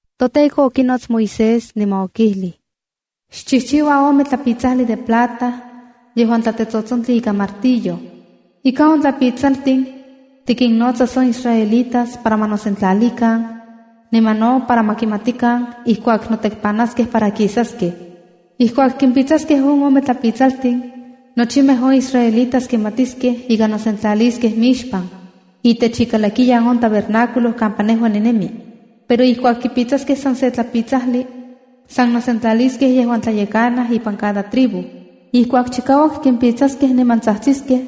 ToTEKO okinots Moisés niman okijlij: “Xchijchiua ome tlapitsajli de plata yejuan tlatetsotsontli ikan martillo. Ika on tlapitsaltin tikinnotsas on israelitas para ma nosentlalikan, niman no para ma kimatikan ijkuak notekpanaskej para kisaskej. Ijkuak kimpitsaskej on ome tlapitsaltin, nochimej on israelitas kimatiskej ika nosentlaliskej mixpan, itech ikalakiyan on tabernáculo kampa nejua ninemi. Pero ijkuak kipitsaskej san se tlapitsajli, san nosentlaliskej yejuan tlayekanaj ipan cada tribu. Ijkuak chikauak kimpitsaskej niman tsajtsiskej,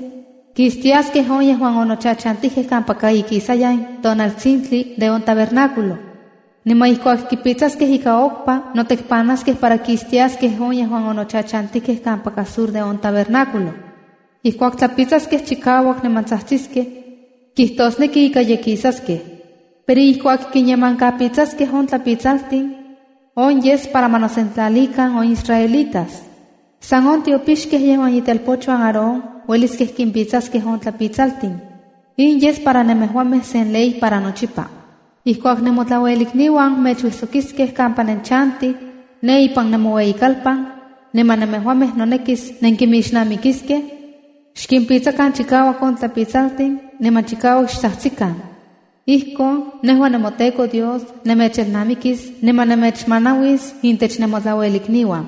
kistiaskej on yejuan onochachantijkej kampaka ikisayan tonaltsintli de on tabernáculo. Niman ijkuak kipitsaskej ika okpa, notekpanaskej para kistiaskej on yejuan onochachantijkej kampaka sur de on tabernáculo. Ijkuak tlapitsaskej chikauak niman tsajtsiskej, kijtosneki ika ye kisaskej. Pero ijkuak kinyemankapitsaskej on tlapitsaltin, on yes para ma nosentlalikan, on israelitas. San on tiopixkej, yejuan itelpochuan Aarón, ueliskej kimpitsaskej on tlapitsaltin. In yes para nemejuamej sen ley para nochipa. ’Ijkuak nemotlauelikniuan mechuijsokiskej kampa nenchantij ne ipan nemoueyitlalpan, niman nemejuamej nonekis nenkinmixnamikiskej, xkimpitsakan chikauak on tlapitsaltin niman chikauak xtsajtsikan. Ijkon nejua nemoTEKO Dios nemechelnamikis, niman nemechmanauis intech nemotlauelikniuan.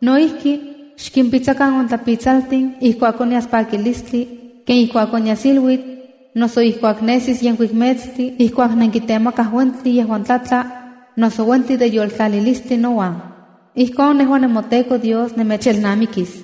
No ijki, xkimpitsakan on tlapitsaltin ijkuak onyas pakilistli, ken ijkuak onyas iluitl, noso ijkuak nesi yenkuik metstli, ijkuak nenkitemakaj uentli yejuan tlatla, noso uentli de yoltlalilistli nouan. Ijkon nejua yejuan nemoTEKO Dios nemechelnamikis.”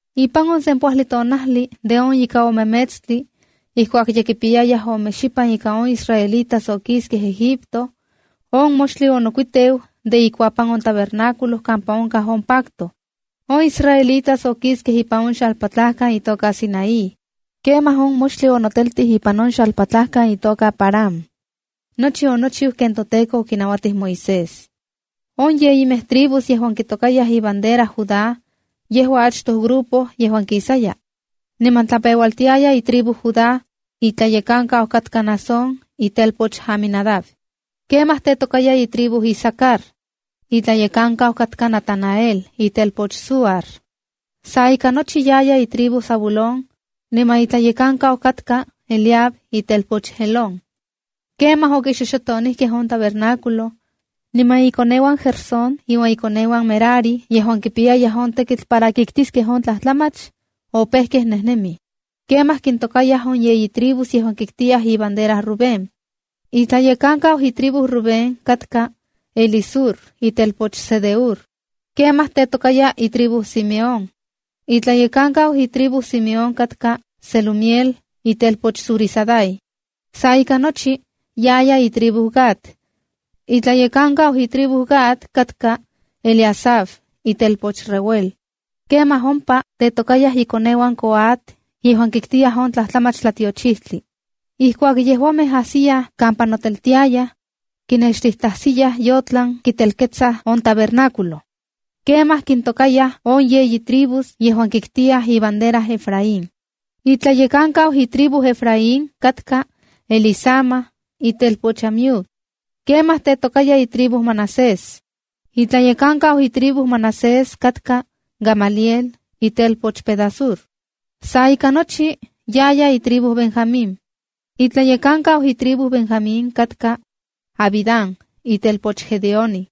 Ipan on sempoajli tonajli de on ika ome metstli ijkuak ye kipiyayaj ome xipan ika on israelitas okiskej Egipto, on moxtli onokuiteu de ikuapan on tabernáculo kampa onkaj on pacto. On israelitas okiskej ipan on xalpatlajkan itoka Sinaí. Kemaj on moxtli onoteltij ipan on xalpatlajkan itoka Parán. Nochi onochiu ken toTEKO okinauatij Moisés. On yeyimej tribus yejuan kitokayaj ibandera Judá, yejua achtoj grupo yejuan kisaya. Niman tlapeualtiaya itribu Judá, itlayekankau katka Naasón, itelpoch Aminadab. Kemaj tetokaya itribu Isacar. Itlayekankau katka Natanael, itelpoch Zuar. Sa ika nochi yaya itribu Zabulón, niman itlayekankau katka Eliab, itelpoch Helón. Kemaj okixoxotonijkej on tabernáculo, niman ikoneuan Gersón iuan ikoneuan Merari yejuan kipiyayaj on tekitl para kiktiskej on tlajtlamach, opejkej nejnemij. Kemaj kintokayaj on yeyi tribus yejuan kiktiyaj ibandera Rubén. Itlayekankau itribu Rubén katka Elisur, itelpoch Sedeur. Kemaj tetokaya itribu Simeón. Itlayekankau itribu Simeon katka Selumiel, itelpoch Zurisadai. Sa ika nochi yaya itribu Gad. Itlayekankau itribu Gad katka Eliasaf, itelpoch Ruel. Kemaj ompa tetokayaj ikoneuan Coat yejuan kiktiyaj on tlajtlamach tlatiochijtli. Ijkuak yejuamej ajsiyaj kampa noteltiayaj, kinextijtatajsiyaj yotlan kitelketsaj on tabernáculo. Kemaj kintokayaj on yeyi tribus yejuan kiktiyaj ibandera Efraín. Itlayekankau itribu Efraín katka Elisama, itelpoch Amiud. Kemaj tetokaya itribu Manasés. Itlayekankau itribu Manasés katka Gamaliel, itelpoch Pedasur. Sa ika nochi yaya itribu Benjamín. Itlayekankau itribu Benjamín katka Abidán, itelpoch Gedeoni.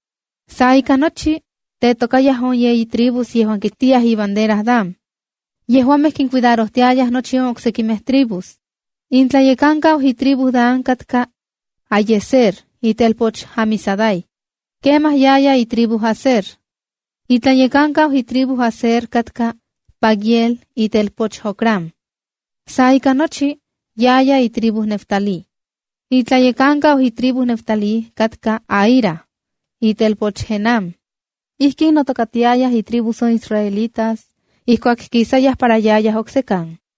Sa ika nochi, tetokayaj on yeyi tribus yejuan kiktiyaj ibandera Dan. Yejuamej kincuidarojtiayaj nochi on oksekimej tribus. Itlayekankau itribu Dan katka Ahiezer, itelpoch Amisadai. Kemaj yaya itribu Aser. Itlayekankau itribu Aser katka Pagiel, itelpoch Ocrán. Sa ika nochi yaya itribu Neftalí. Itlayekankau itribu Neftalí katka Ahira, itelpoch Enán. Ijkin notokatiayaj itribus on israelitas ijkuak kisayaj para yayaj oksekan.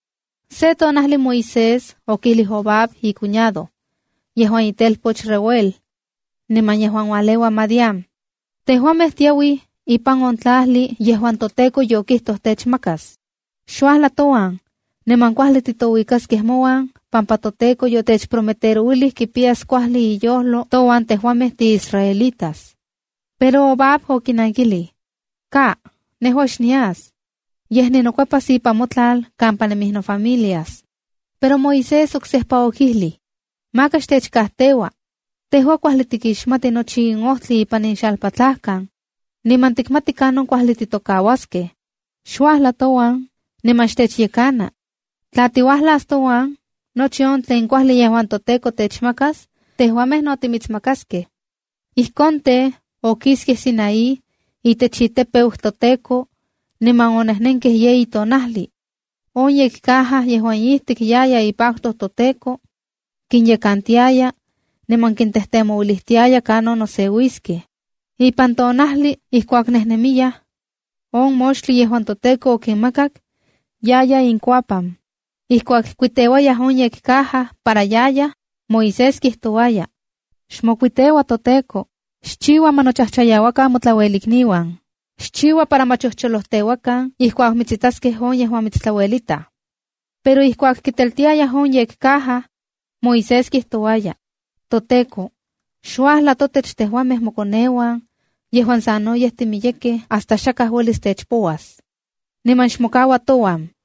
Se tonajli Moisés okijlij Hobab icuñado, yejuan itelpoch Reuel niman yejuan ualeua Madián: —Tejuamej tiauij ipan on tlajli yejuan toTEKO yokijtoj techmakas. Xuajla touan, niman kuajli titouikaskej mouan, pampa toTEKO yotechprometerouilij kipiyas kuajli iyojlo touan tejuamej tiisraelitas. Pero Hobab okinankilij: —Ka, nejua xnias. Yej ninokuepas ipan notlal kampa nemij nofamilias. Pero Moisés oksejpa okijlij: —Maka xtechkajteua. Tejua kuajli tikixmati nochi in ojtli ipan in xalpatlajkan, niman tikmati kanon kuajli titokauaskej. Xuajla touan niman xtechyekana. Tla tiuajlas touan, nochi on tlen kuajli yejuan toTEKO techmakas, tejuamej no timitsmakaskej. Ijkon tej, okiskej Sinaí, itech itepeu toTEKO niman onejnenkej yeyi tonajli. On yekcaja yejuan ijtik yaya ipacto toTEKO, kinyekantiaya niman kintejtemouilijtiaya kanon noseuiskej. Ipan tonajli ijkuak nejnemiyaj, on moxtli yejuan toTEKO okinmakak yaya inkuapan. Ijkuak kuiteuaj on yekcaja para yayaj, Moisés kijtouaya: “¡Xmokuiteua toTEKO! ¡Xchiua para ma nochojchoyauakan motlauelikniuan! ¡Xchiua para ma cholojteuakan ijkuak mitsitaskej on yejuan mitstlauelitaj!” Pero ijkuak kiteltiayaj on yekcaja, Moisés kijtouaya: “¡ToTEKO, xuajla totech tejuamej mokoneuan yejuan sanoyej timiyekej hasta xakaj uelis techpouas! ¡Nikan xmokaua touan!”